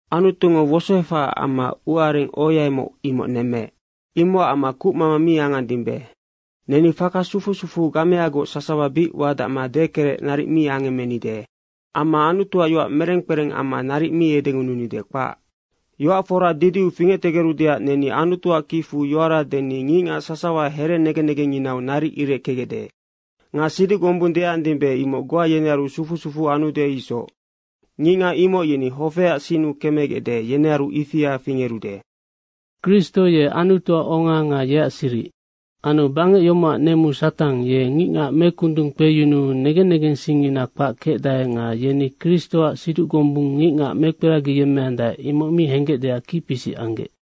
Anutungo wosoefahaac amma ua areng ohoaimoc, imoc nemmeec. Imocac amma kucmama mi angandimbe. Neni faka sufu sufu gameagoc sasawa bic wadacma dekerec naric mi angemmenide. Amma Anutuac yoac mereng kpereng amma naric mi edengununide, kpac. Yoac fora didiu fingectegerudeac neni Anutuac kicfu yoara deni ngicngac sasawa here negen negengnginau naric ireckegecde. Nga siduc gombung deandimbe, imoc goa yenearu sufu sufu anude isoc. Ngicngac imoc yeni hofeac sinnu kemegecde, yenearu ifia fingerude. Kristo ye Anutuac onga nga yeac siric. Anu bangec yomocac nemu Satang, ye ngicngac mekundungkpeyunuu negen negensingngina kpac kecdae nga yeni Kristoac siduc gombungngo ngicngac mekperagiyemmeande, imoc mi henggecdeac kicpisic anggec.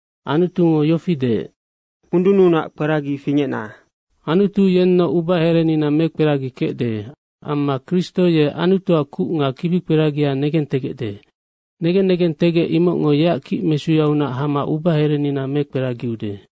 Anutungo yofi deec, “Kundununac kperagi fingecna.” Anutu yennoc ubaherenina mekperagikecde. Amma Kristo ye Anutuac kuc nga kibikperagia negentegecde, negen negentegec imocngo yeac kicmesuyaunac hama ubaherenina mekperagiude.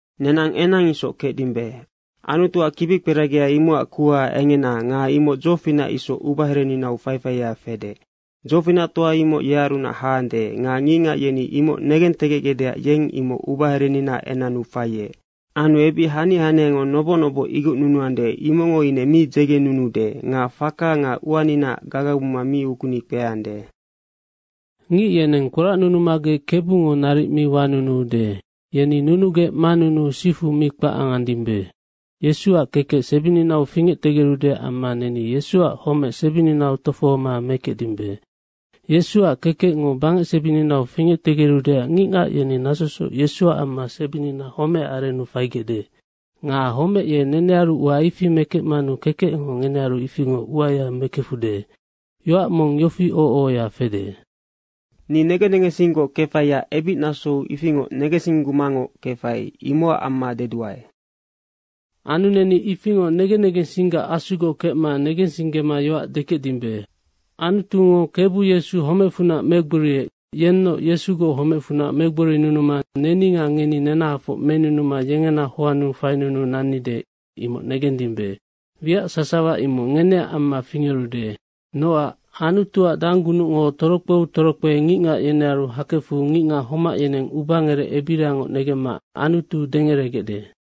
Nenang enang isoc kecdimbe. Anutuac kibikperagia imocac kuha engena nga imoc dzofinac isoc ubahereninau faifaia fede. Dzofinactoa imoc yearunac haande nga ngicngac yeni imoc negentegecgecdeac yeng imoc ubahereninaac enannu faiec. Anu ebic hania haniango noboc noboc igocnunuande, imocngo ine mi dzegenunuude. Nga faka nga uaninaac gagabuma mi ukuni kpeande. Ngic yeneng kporacnunumagec Kebungo naric mi wanunuude. Yeni nunugec manunuu sifu mi kpac angandimbe. Yesuac kekec sebininau fingectegerudeac amma neni Yesuac homec sebininau tofohoma mekecdimbe. Yesuac kekecngo bangecsebininau fingectegerudeac ngicngac yeni nasosoc Yesuac amma sebinina homecac arennu faigecde. Nga homec ye nenearu ua ifi mekecmanu kekecngo ngenearu ifingoc uaya mekefude. Yoac mong yofi oho ohoya fede, “Ni negen negensinggoc kefaiac ebicnasou ifingoc negensinggumangoc kefai, imocac amma deduae.” Anu neni ifingoc negen negensinggac Asugoc kecma negensinggema yoac dekecdimbe. Anutungo Kebu Yesu homecfunac megboriec, yennoc Yesugoc homecfunac megborinunuma neni nga ngeni nenahafoc menunuma yengena hoannu fainunuu nannide, imoc negendimbe. Wiac sasawa imoc ngeneac amma fingerude. Nocac Anutuac danggunucngo torokpeu torokpe ngicngac yenearu hakefu ngicngac homac yeneng ubangerec ebirangoc negemma Anutu dengeregecde.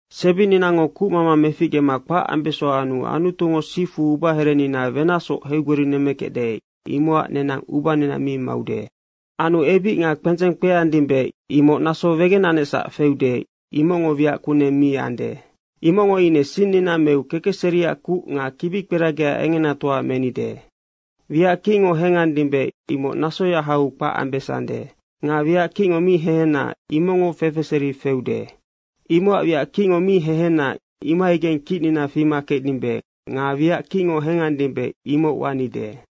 Sebininango kucmama meficgema kpac ambeso anu Anutungo sifu ubaherenina wenacsoc heigborinemmekecde, imocac nenang ubanina mi maude. Anu ebic nga kpendzeng kpeandimbe, imoc naso wegenanecsac feude, imocngo wiac kuneng mi ande. Imocngo ine sinnina meu kekecseriac kuc nga kibikperagia engenatoa menide. Wiac kicngo hengandimbe, imoc nasoya hau kpac ambesande. Nga wiac kicngo mi hehena, imocngo fefeseri feude. Imocac wiac kicngo mi hehena, imohaigeng kicnina fima kecdimbe nga wiac kicngo hengandimbe imoc wanide.